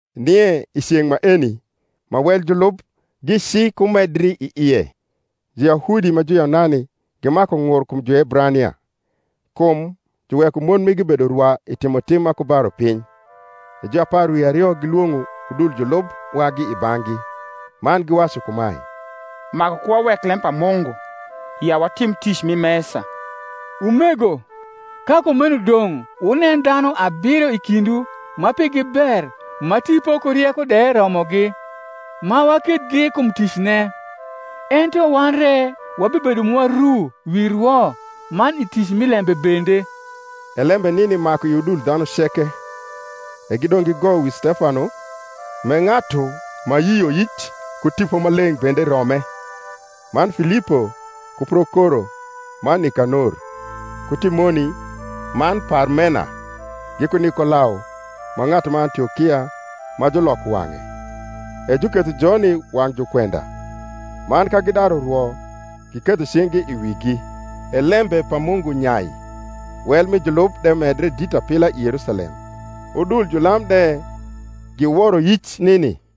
Nie i ceng’ maeni, ma wel julub gicikumedri i ie, Juyahudi ma Juyunani gimaku ng’ur kum Juebrania, kum juweko mon migi bedo rwa i timotim ma ku ba rupiny. E juapar wi ario gilwong’o udul julub wagi i bang’gi, man giwacu kumae, Maku ku wawek lem pa Mungu, ya watim tic mi mesa. Umego, ka kumeno dong’ wunen dhanu abiro i kindwu ma pigi ber ma Tipo ku rieko de romogi, ma wakethgi kum ticne. Ento wan re wabibedo mwa ru wi rwo, man i tic mi lembe bende. E lembe nini maku i udul dhanu ceke: e gidong’ gigoyo wi Stefano, m’e ng’atu ma yioyic ku Tipo Maleng’ bende rome, man Filipo, ku Prokoro man Nikanor, ku Timoni, man Parmena, giku Nikolao ma ng’atu ma Antiokia ma juloko wang’e; e juketho joni wang’ jukwenda: man ka gidaru rwo, giketho cing’gi i wigi. E lembe pa Mungu nyai: wel mi julub de medre dit apila i Yerusalem; udul julam de giworo yic nini.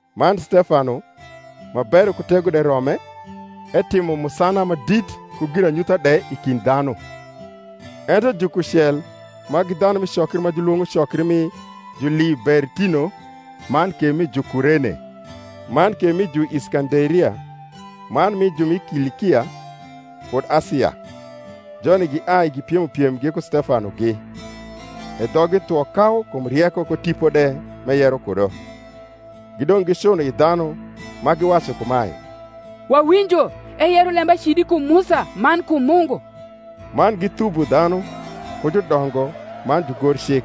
Man Stefano, ma bero ku tego de rome, etimo musana ma dit ku giranyutha de i kind dhanu. Ento jukucel ma gi dhanu mi cokri ma julwong’o cokri mi Julibertino, man ke mi Jukurene, man ke mi Juiskanderia, man mi ju mi Kilikia kud Asia, joni giai gipiemo piem giku Stefanogi. E dhoggi thwo kau kum rieko ku Tipo de m’eyero kudo. Gidong’ gicuno i dhanu, ma giwacu kumae, Wawinjo eyero lembacidi kum Musa man kum Mungu. Man githubo dhanu, ku judongo, man jugorcik,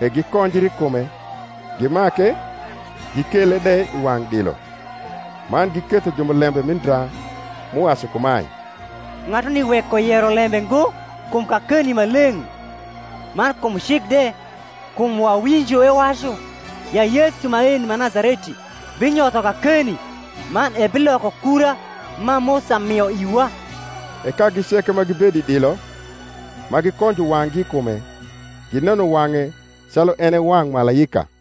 e gikonjri i kume, gimake, gikele de i wang’ dilo, man giketho jumulembe mi ndra, m’uwacu kumae, Ng’atuni weko yero lembe ngo kum kakeni ma leng’, man kum cik de: kum wawinjo ewacu ya Yesu maeni ma Nazareti binyotho kakeni, man ebiloko kura ma Musa mio iwa. E kagi ceke ma gibedo i dilo, ma gikonjo wang’gi i kume, gineno wang’e calu en e wang’ malaika.